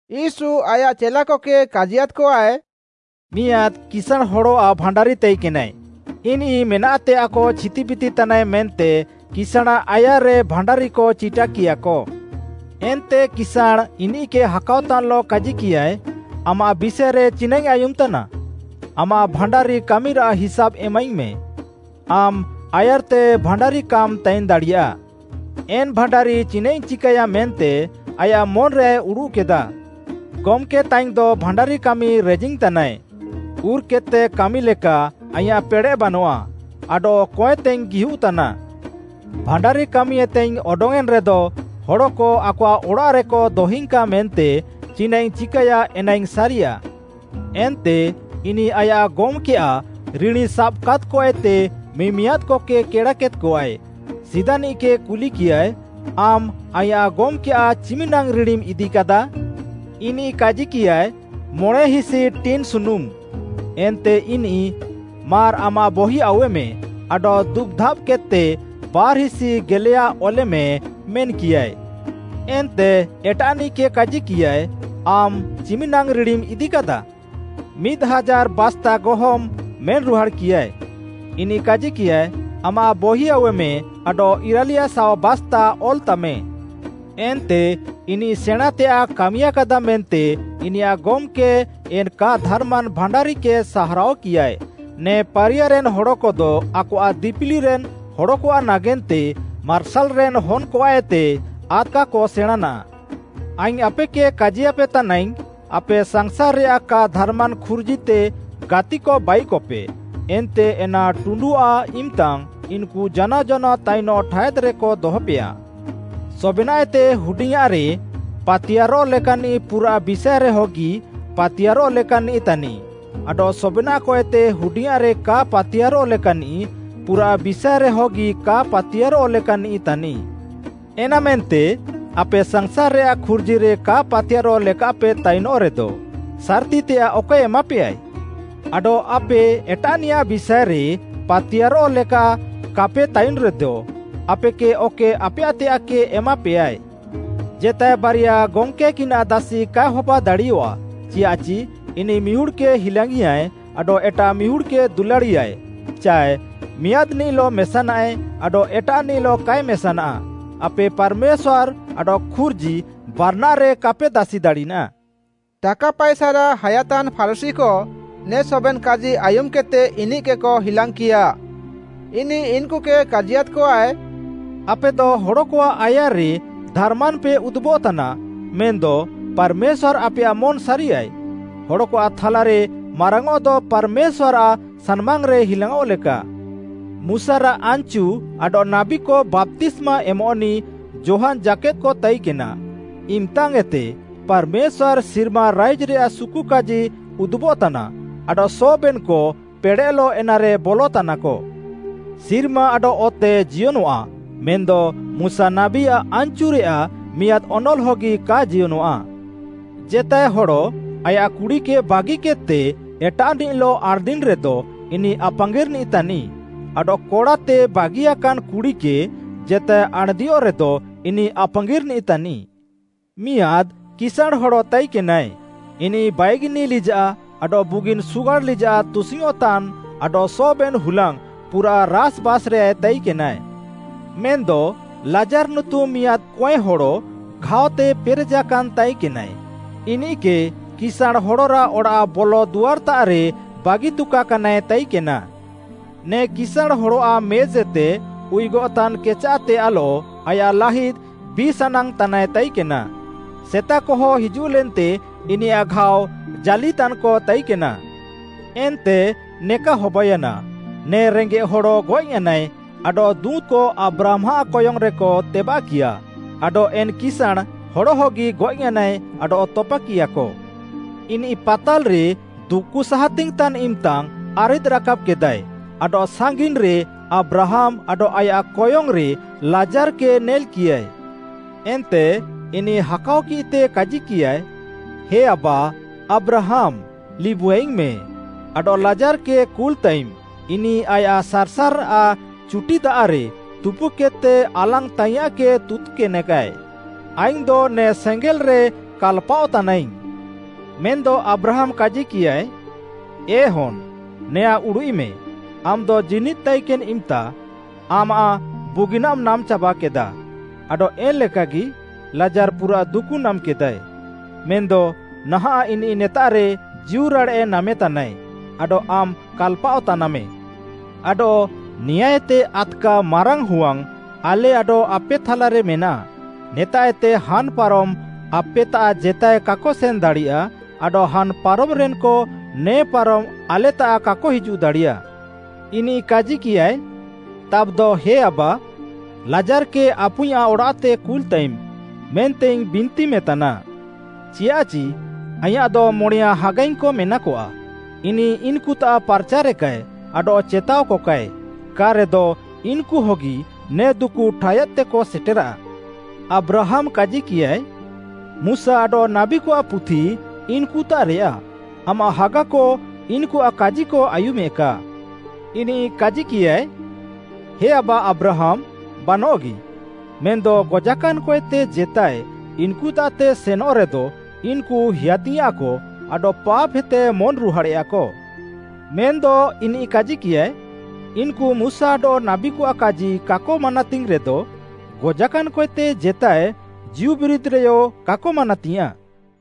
ୟୀଶୁ ଆୟାଃ ଚେଲାକକେ କାଜିୟାଦ୍‌କଆଏ, “ମିଆଁଦ୍‌ କିସାଁଣ୍‌ ହଡ଼ଆଃ ଭାଣ୍ଡାରି ତାଇକେନାଏ, ଇନିଃ ମେନାଃତେୟାଃକ ଛିତିବିତି ତାନାଏ ମେନ୍ତେ କିସାଁଣାଃ ଆୟାର୍‌ରେ ଭାଣ୍ଡାରିକ ଚିଟାକିୟାଃକ। ଏନ୍ତେ କିସାଁଣ୍‌ ଇନିଃକେ ହାକାଅତାନ୍‌ଲଃ କାଜିକିୟାଏ, ‘ଆମାଃ ବିଷାଏରେ ଚିନାଃଇଙ୍ଗ୍‌ ଆୟୁମ୍‌ତାନା? ଆମାଃ ଭାଣ୍ଡାରି କାମିରାଃ ହିସାବ୍‌ ଏମାଇଙ୍ଗ୍‌ମେ, ଆମ୍‌ ଆୟାର୍‌ତେ ଭାଣ୍ଡାରି କାମ୍‌ ତାଇନ୍‌ଦାଡ଼ିୟାଃ। ଏନ୍‌ ଭାଣ୍ଡାରି ଚିନାଃଇଙ୍ଗ୍‌ ଚିକାୟା ମେନ୍ତେ ଆୟାଃ ମନ୍‌ରେୟାଏ ଉଡୁଃକେଦାଃ, ଗମ୍‌କେତାଇଙ୍ଗ୍‌ଦ ଭାଣ୍ଡାରି କାମି ରେଜିଙ୍ଗ୍‌ତାନାଏ। ଉର୍‌କେଦ୍‌ତେ କାମିଲେକା ଆଇଁୟାଃ ପେଡ଼େଃ ବାନଃଆ, ଆଡଃ କଏଁତେଇଙ୍ଗ୍‌ ଗିହୁଃତାନା। ଭାଣ୍ଡାରିକାମିଏତେଇଙ୍ଗ୍‌ ଅଡଙ୍ଗ୍‌ଏନ୍‌ରେଦ ହଡ଼କ ଆକଆଃ ଅଡ଼ାଃରେକ ଦହିଙ୍କା ମେନ୍ତେ ଚିନାଃଇଙ୍ଗ୍‌ ଚିକାୟା ଏନାଇଙ୍ଗ୍‌ ସାରିୟାଃ।’ “ଏନ୍ତେ ଇନିଃ ଆୟାଃ ଗମ୍‌କେୟାଃ ରିଣୀସାବାକାଦ୍‌କଏତେ ମିମିଆଦ୍‌କକେ କେଡ଼ାକେଦ୍‌କଆଏ। ସିଦାନିଃକେ କୁଲିକିୟାଏ, ‘ଆମ୍‌ ଆଇଁୟାଃ ଗମ୍‌କେୟାଃ ଚିମିନାଙ୍ଗ୍‌ ରିଣୀମ୍‌ ଇଦିକାଦା?’ ଇନିଃ କାଜିକିୟାଏ ‘ମଣେଁହିସି ଟିନ୍‌ ସୁନୁମ୍‌।’ ଏନ୍ତେ ଇନିଃ, ‘ମାର୍‌ ଆମାଃ ବହି ଆଉୱେମେ ଆଡଃ ଦୁବ୍‌ଧାବ୍‌କେଦ୍‌ତେ ବାର୍‌ହିସି ଗେଲେୟା ଅଲେମେ’ ମେନ୍‌କିୟାଏ। ଏନ୍ତେ ଏଟାଃନିଃକେ କାଜିକିୟାଏ, ‘ଆମ୍‌ ଚିମ୍‌ନାଙ୍ଗ୍‌ ରିଣୀମ୍‌ ଇଦିକାଦା?’ ‘ମିଦ୍‌ ହାଜାର୍‌ ବାସ୍ତା ଗହମ୍‌’ ମେନ୍‌ରୁହାଡ଼୍‌କିୟାଏ। ଇନିଃ କାଜିକିୟାଏ, ‘ଆମାଃ ବହି ଆଉୱେମେ ଆଡଃ ଇରାଲିୟାଶାଅ ବାସ୍ତା ଅଲ୍‌ତାମେ।’ “ଏନ୍ତେ ଇନିଃ ସେଣାଁଁତେୟାଏ କାମିୟାକାଦା ମେନ୍ତେ ଇନିୟାଃ ଗମ୍‌କେ ଏନ୍‌ କା ଧାର୍‌ମାନ୍‌ ଭାଣ୍ଡାରିକେ ସାହାରାଅକିୟାଏ। ନେ ପାରିୟାରେନ୍‌ ହଡ଼କଦ ଆକଆଃ ଦିପିଲିରେନ୍ ହଡ଼କଆଃ ନାଗେନ୍ତେ ମାର୍ସାଲ୍‌ରେନ୍‌ ହନ୍‌କଆଃଏତେ ଆଦ୍‌କାକ ସେଣାଁଁନାଃ।” ଆଇଙ୍ଗ୍‌ ଆପେକେ କାଜିୟାପେ ତାନାଇଙ୍ଗ୍‌, ଆପେ ସାଂସାର୍‌ରେୟାଃ କା ଧାର୍‌ମାନ୍‌ ଖୁର୍ଜିତେ ଗାତିକ ବାଇକପେ, ଏନ୍ତେ ଏନା ଟୁଣ୍ଡୁଅଃ ଇମ୍‌ତାଙ୍ଗ୍‌ ଇନ୍‌କୁ ଜାନାଅ ଜାନାଅ ତାଇନଃ ଠାୟାଦ୍‌ରେକ ଦହପେୟା। ସବେନାଃଏତେ ହୁଡିଙ୍ଗ୍‌ଆଁରେ ପାତିୟାର୍‌ରଃ ଲେକାନ୍‌ନିଃ ପୁରାଃ ବିଷାଏରେହଗି ପାତିୟାର୍‌ରଃ ଲେକାନ୍‌ନିଃ ତାନିଃ ଆଡଃ ସବେନାଃଏତେ ହୁଡିଙ୍ଗ୍‌ଆଁରେ କା ପାତିୟାର୍‌ରଃ ଲେକାନ୍‌ନିଃ ପୁରାଃ ବିଷାଏରେହଗି କା ପାତିୟାର୍‌ରଃ ଲେକାନ୍‌ନିଃ ତାନିଃ। ଏନାମେନ୍ତେ ଆପେ ସାଂସାର୍‌ରେୟାଃ ଖୁର୍ଜିରେ କା ପାତିୟାର୍‌ରଃ ଲେକାପେ ତାଇନଃରେଦ, ସାର୍‌ତିତେୟାଃ ଅକଏ ଏମାପେୟାଏ? ଆଡଃ ଆପେ ଏଟାଃନିୟାଃ ବିଷାଏରେ ପାତିୟାର୍‌ରଃ ଲେକା କାପେ ତାଇନ୍‌ରେଦ ଆପେକେ ଅକଏ ଆପେୟାଃତେୟାଃକେ ଏମାପେୟାଏ। “ଜେତାଏ ବାରିଆ ଗମ୍‌କେକିନାଃ ଦାସି କାଏ ହବାଦାଡ଼ିୟଃଆ, ଚିୟାଃଚି ଇନିଃ ମିହୁଡ଼୍‌କେ ହିଲାଙ୍ଗ୍‌ଇୟାଏ ଆଡଃ ଏଟାଃ ମିହୁଡ଼୍‌କେ ଦୁଲାଡ଼ିୟାଏ, ଚାଏ ମିଆଁଦ୍‌ନିଃଲଃ ମେସାନାଏ ଆଡଃ ଏଟାଃନିଃଲଃ କାଏ ମେସାନା। ଆପେ ପାର୍‌ମେଶ୍ୱାର୍‌ ଆଡଃ ଖୁର୍ଜି ବାରାନାଃରେ କାପେ ଦାସିଦାଡ଼ିନା।” ଟାକା ପାଏସାରାଃ ହାୟାତାନ୍‌ ଫାରୁଶୀକ ନେ ସବେନ୍‌ କାଜି ଆୟୁମ୍‌କେଦ୍‌ତେ, ଇନିଃକେକ ହିଲାଙ୍ଗ୍‌କିୟା। ଇନିଃ ଇନ୍‌କୁକେ କାଜିୟାଦ୍‌କଆଏ, “ଆପେଦ ହଡ଼କଆଃ ଆୟାର୍‌ରେ ଧାର୍‌ମାନ୍‌ପେ ଉଦୁବଃତାନା, ମେନ୍‌ଦ ପାର୍‌ମେଶ୍ୱାର୍‌ ଆପେୟାଃ ମନ୍‌ ସାରିୟାଏ। ହଡ଼କଆଃ ଥାଲାରେ ମାରାଙ୍ଗ୍‌ଅଃଦ ପାର୍‌ମେଶ୍ୱାର୍‌ଆଃ ସାନ୍‌ମାଙ୍ଗରେ ହିଲାଙ୍ଗ୍‌ଅଃଲେକା। “ମୁଶାରାଃ ଆନ୍‌ଚୁ ଆଡଃ ନାବୀକ ବାପ୍ତିସ୍ମା ଏମଃନିଃ ଯୋହାନ୍‌ ଜାକେଦ୍‌କ ତାଇକେନା, ଇମ୍‌ତାଙ୍ଗ୍‌ଏତେ ପାର୍‌ମେଶ୍ୱାର୍‌ଆଃ ସିର୍ମା ରାଇଜ୍‌ରେୟାଃ ସୁକୁକାଜି ଉଦୁବଃତାନା ଆଡଃ ସବେନ୍‌କ ପେଡ଼େଃଲଃ ଏନାରେ ବଲଃତାନାକ। ସିର୍ମା ଆଡଃ ଅତେ ଜିୟନଃଆ ମେନ୍‌ଦ ମୁଶା ନାବୀଆଃ ଆନ୍‌ଚୁରେୟାଃ ମିଆଁଦ୍‌ ଅନଲ୍‌ ହଗି କା ଜିୟନଃଆ। “ଜେତାଏ ହଡ଼ ଆୟାଃ କୁଡ଼ିକେ ବାଗିକେଦ୍‌ତେ ଏଟାଃନିଃଲଃ ଆଣ୍‌ଦିନ୍‌ରେଦ ଇନିଃ ଆପାଙ୍ଗିର୍‌ନିଃ ତାନିଃ ଆଡଃ କଡ଼ାତେ ବାଗିୟାକାନ୍‌ କୁଡ଼ିକେ ଜେତାଏ ଆଣ୍‌ଦିୟଃରେଦ ଇନିଃ ଆପାଙ୍ଗିର୍‌ନିଃ ତାନିଃ। “ମିଆଁଦ୍‌ କିସାଁଣ୍‌ ହଡ଼ ତାଇକେନାଏ, ଇନିଃ ବାଇଗିନିଆ ଲିଜାଃ ଆଡଃ ବୁଗିନ୍‌ ସୁଗାଡ଼୍‌ ଲିଜାଃ ତୁସିଙ୍ଗ୍‌ଅଃଁତାନ୍‌ ଆଡଃ ସବେନ୍‌ ହୁଲାଙ୍ଗ୍‌ ପୁରାଃ ରାସ୍‌ବାସ୍‌ରେୟାଏ ତାଇକେନା। ମେନ୍‌ଦ ଲାଜାର୍‌ ନୁତୁମ୍‌ ମିଆଁଦ୍‌ କଏଁହଡ଼ ଘାଅତେ ପେରେଜାକାନ୍‌ ତାଇକେନାଏ, ଇନିଃକେ କିସାଁଣ୍‌ ହଡ଼ରାଃ ଅଡ଼ାଃ ବଲଦୁଆର୍‌ତାଃରେ ବାଗିତୁକାକାନାଏ ତାଇକେନା। ନେ କିସାଁଣ୍‌ ହଡ଼ଆଃ ମେଜ୍‌ଏତେ ଉୟୁଗଃତାନ୍‌ କେଚାଃତେୟାଃଲଃ ଆୟାଃ ଲାହିଦ୍‌ ବିଏ ସାନାଙ୍ଗ୍‌ତାନାଏ ତାଇକେନା, ସେତାକହ ହିଜୁଃଲେନ୍ତେ ଇନିୟାଃ ଘାଅ ଜାଲ୍‌ଇତାନ୍‌କ ତାଇକେନା। “ଏନ୍ତେ ନେକା ହବାୟାନା, ନେ ରେଙ୍ଗେଃ ହଡ଼ ଗଏଃୟାନାଏ ଆଡଃ ଦୁଁତ୍‌କ ଆବ୍ରାହାମ୍‌ଆଃ କୟଙ୍ଗ୍‌ରେକ ତେବାଃକିୟା, ଆଡଃ ଏନ୍‌ କିସାଁଣ୍‌ ହଡ଼ହଗି ଗଏଃୟାନାଏ ଆଡଃ ତପାକିୟାଃକ। ଇନିଃ ପାତାଲ୍‌ରେ ଦୁକୁସାହାତିଙ୍ଗ୍‌ତାନ୍‌ ଇମ୍‌ତା ଆରିଦ୍‌ରାକାବ୍‌କେଦାଏ ଆଡଃ ସାଙ୍ଗିନ୍‌ରେ ଆବ୍ରାହାମ୍‌ ଆଡଃ ଆୟାଃ କୟଙ୍ଗ୍‌ରେ ଲାଜାର୍‌କେ ନେଲ୍‌କିୟାଏ। ଏନ୍ତେ ଇନିଃ ହାକାଅକିଃତେ କାଜିକିୟାଏ, ‘ହେ ଆବା, ଆବ୍ରାହାମ୍‌ ଲିବୁଆଇଙ୍ଗ୍‌ମେଁ ଆଡଃ ଲାଜାର୍‌କେ କୁଲ୍‌ତାଇମ୍‌ ଇନିଃ ଆୟାଃ ସାର୍‌ସାର୍‌ରାଃ ଚୁଟି ଦାଆଃରେ ତୁପୁକେଦ୍‌ତେ ଆଲାଙ୍ଗ୍‌ତାଇୟାଁଃକେ ତୁତ୍‌କେନେକାଏ, ଆଇଙ୍ଗ୍‌ଦ ନେ ସେଙ୍ଗେଲ୍‌ରେ କାଲ୍‌ପାଅଃତାନାଇଙ୍ଗ୍‌।’ ମେନ୍‌ଦ ଆବ୍ରାହାମ୍‌ କାଜିକିୟାଏ, ‘ଏ ହନ୍‌, ନେଆଁଁ ଉଡ଼ୁଃଇମେ, ଆମ୍‌ଦ ଜୀନିଦ୍‌ ତାଇକେନ୍‌ ଇମ୍‌ତା ଆମାଃ ବୁଗିନାଃମ୍‌ ନାମ୍‌ଚାବାକେଦାଃ ଆଡଃ ଏନ୍‌ ଲେକାଗି ଲାଜାର୍‌ ପୁରାଃ ଦୁକୁ ନାମ୍‌କେଦାଏ, ମେନ୍‌ଦ ନାହାଁଃ ଇନିଃ ନେତାଃରେ ଜୀଉରାଡ଼େଃ ନାମେତାନାଏ ଆଡଃ ଆମ୍‌ କାଲ୍‌ପାଅଃତାନାମେ। ଆଡଃ ନେଆଁଁଏତେ ଆଦ୍‌କା ମାରାଙ୍ଗ୍‌ ହୁୱାଙ୍ଗ୍‌ ଆଲେ ଆଡଃ ଆପେ ଥାଲାରେ ମେନାଃ, ନେତାଃଏତେ ହାନ୍‌ପାରମ୍‌ ଆପେତାଃ ଜେତାଏ କାକ ସେନ୍‌ଦାଡ଼ିୟା ଆଡଃ ହାନ୍‌ପାରମ୍‌ରେନ୍‌କ ନେ ପାରମ୍‌ ଆଲେତାଃ କାକ ହିଜୁଃଦାଡ଼ିୟାଃ।’ ଇନିଃ କାଜିକିୟାଏ, ‘ତାବ୍‌ଦ ହେ ଆବା, ଲାଜାର୍‌କେ ଆପୁଇଁୟାଃ ଅଡ଼ାଃତେ କୁଲ୍‌ତାଇମ୍‌, ମେନ୍ତେଇଙ୍ଗ୍‌ ବିନ୍ତିମେ ତାନା। ଚିୟାଃଚି ଆଇଁୟାଃଦ ମଣେୟାଁ ହାଗାଇଙ୍ଗ୍‌କ ମେନାକଆ, ଇନିଃ ଇନ୍‌କୁତାଃ ପାର୍‌ଚାରେକାଏ, ଆଡଃ ଚେତାଅକକାଏ, କା'ରେଦ ଇନ୍‌କୁହଗି ନେ ଦୁକୁ ଠାୟାଦ୍‌ତେକ ସେଟେରାଃ।’ “ଆବ୍ରାହାମ୍‌ କାଜିକିୟାଏ, ‘ମୁଶା ଆଡଃ ନାବୀକଆଃ ପୁଥି ଇନ୍‌କୁତାଃରେୟାଃ; ଆମାଃ ହାଗାକ ଇନ୍‌କୁଆଃ କାଜିକ ଆୟୁମେକା।’ ଇନିଃ କାଜିକିୟାଏ, ‘ହେ ଆବା ଆବ୍ରାହାମ୍‌, ବାନଃଗି! ମେନ୍‌ଦ ଗଜାକାନ୍‌କଏତେ ଜେତାଏ ଇନ୍‌କୁତାଃତେ ସେନଃରେଦ ଇନ୍‌କୁ ହେୟାତିଙ୍ଗେଆକ ଆଡଃ ପାପ୍‌ହେତେ ମନ୍‌ରୁହାଡ଼େୟାକ।’ ମେନ୍‌ଦ ଇନିଃ କାଜିକିୟାଏ, ‘ଇନ୍‌କୁ ମୁଶା ଆଡଃ ନାବୀକଆଃ କାଜି କାକ ମାନାତିଙ୍ଗ୍‌ରେଦ, ଗଜାକାନ୍‌କଏତେ ଜେତାଏ ଜୀଉବିରିଦଃରେୟ କାକ ମାନାତିୟାଁଃ।’”